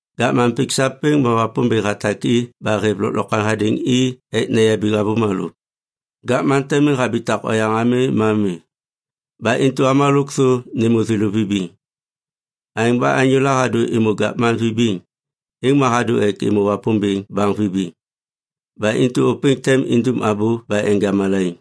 Gavman pik sapêŋ ma Wapômbêŋ hatak i ba hêv lôklokwaŋ hadêŋ i ek neyabiŋ avômalô. Gavman te miŋ habitak oyaŋ ami ma mi. Ba intu avômalô lôkthô nêmô thêlô vibiŋ. Aêŋ ba anyôla hadô êmô gavman vibiŋ, êŋ ma hadô ek êmô Wapômbêŋ baŋ vibiŋ. Ba intu ôpêŋ tem indum abô ba enja malaiŋ.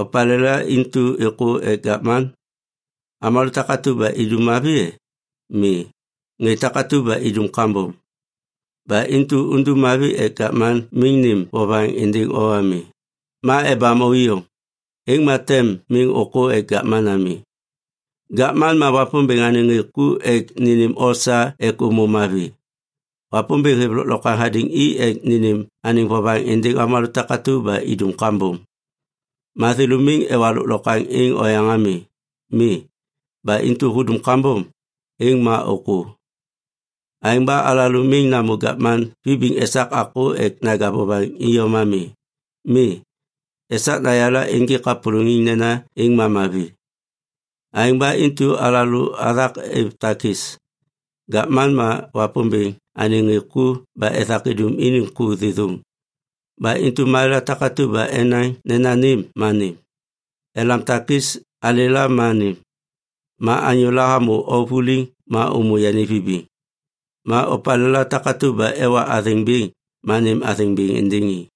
Opalêla intu êkô ek gavman? Avômalô takatu ba idum mavi e? Mi, ŋê takatu ba idum kambom. Ba intu undum mavi ek gavman miŋ nêm vovaŋ êndêŋ o ami, ma embam o iyom. Êŋ ma tem miŋ ôkô ek gavman ami. Gavman ma Wapômbêŋ anêŋ ŋê ku ek nênêm o sa ek ômô mavi. Wapômbêŋ hêv lôklokwaŋ hadêŋ i ek nênêm anêŋ vovaŋ êndêŋ avômalô takatu ba idum kambom. Ma thêlô miŋ ewa lôklokwaŋ êŋ oyaŋ ami. Mi, ba intu hudum kambom, êŋ ma ôkô. Aêŋ ba alalô miŋ namô gavman vibiŋ esak akô ek naja vovaŋ iyom ami. Mi, esak nayala ênjêk kapôlôŋiŋ nena êŋ ma mavi. Aêŋ ba intu alalô athak êv takis. Gavman ma Wapômbêŋ anêŋ ŋê ku ba ethak idum iniŋ ku thêthôŋ. Ba intu malêla takatu ba enaŋ nena nêm ma nêm. Elam takis alêla ma nêm. Ma anyôla hamô o vuliŋ ma ômô yani vibiŋ. Ma opalêla takatu ba ewa athêŋ bêŋ ma nêm athêŋ bêŋ êndêŋ i.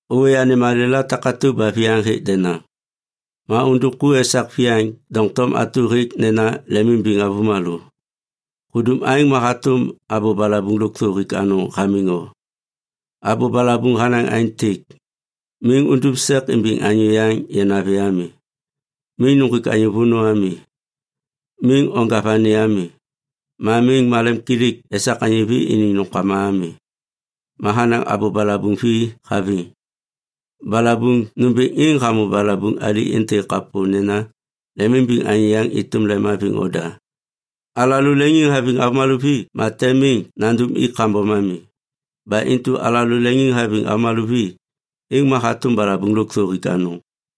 Ôwê anêm malêla takatu ba viyaŋ hêk denaŋ. Ma undum ku esak viyaŋ doŋtom atu hêk nena lemimbiŋ avômalô. Hudum aêŋ ma hatôm abô balabuŋ lôkthô hik anôŋ hamiŋ o. Abô balabuŋ hanaŋ aêntêk, “Miŋ undum sek imbiŋ anyô yaŋ yanavi ami. Miŋ nuŋgwik anyô vônô ami. Miŋ onja vani ami. Ma miŋ malemkilik esak anyô vi iniŋ nômkama ami.” Ma hanaŋ abô balabuŋ vi haviŋ. Balabuŋ nômbêŋ êŋ hamô balabuŋ ali êntêk kapô nena, “Lemimbiŋ anyô yaŋ êtôm lemhaviŋ oda.” Alalô leŋiŋhaviŋ avômalô vi ma tem miŋ nandum i kambom ami. Ba intu alalô leŋiŋhaviŋ avômalô vi, êŋ ma hatôm balabuŋ lôkthô hik anôŋ.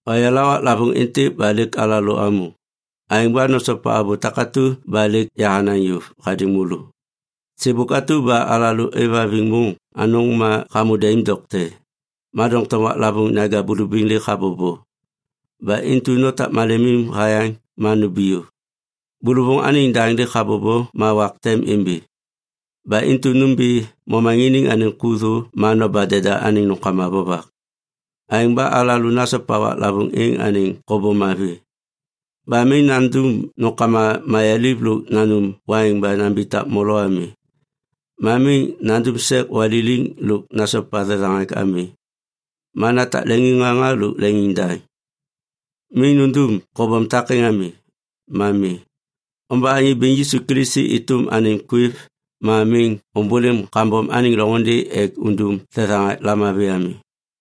Oyala waklavôŋ êntêk ba lêk alalô amô, aêŋ ba nosopa abô takatu ba lêk yahanaŋ yôv hadêŋ môlô. Sêbôk atu ba alalô aêvhaviŋ môŋ anôŋ ma hamô daim dokte, ma doŋtom waklavôŋ naja bulubiŋ lêk habobo. Ba intu notak malemim hayaŋ ma numbiyô. Bôlôvôŋ anêŋ daŋ lêk habobo ma wak tem imbi. Ba intu nômbi momaŋiniŋ anêŋ ku thô ma noba deda anêŋ nômkama vovak. Aêŋ ba alalô nasopa waklavôŋ êŋ anêŋ kobom mavi. Ba miŋ nandum nômkama mayaliv lôk nanum waiŋ ba nambitak molo ami. Ma miŋ nandum sek waliliŋ lôk nasopa thethaŋak ami. Ma natak leŋiŋŋaŋa lôk leŋiŋdaŋ. Miŋ nundum kobom takêŋ ami, ma mi. Omba Anyô Bêŋ Yisu Kilisi êtôm anêm kwêv ma miŋ ômbôlêm kambom anêŋ loŋôndê ek undum thethaŋak lamavi ami.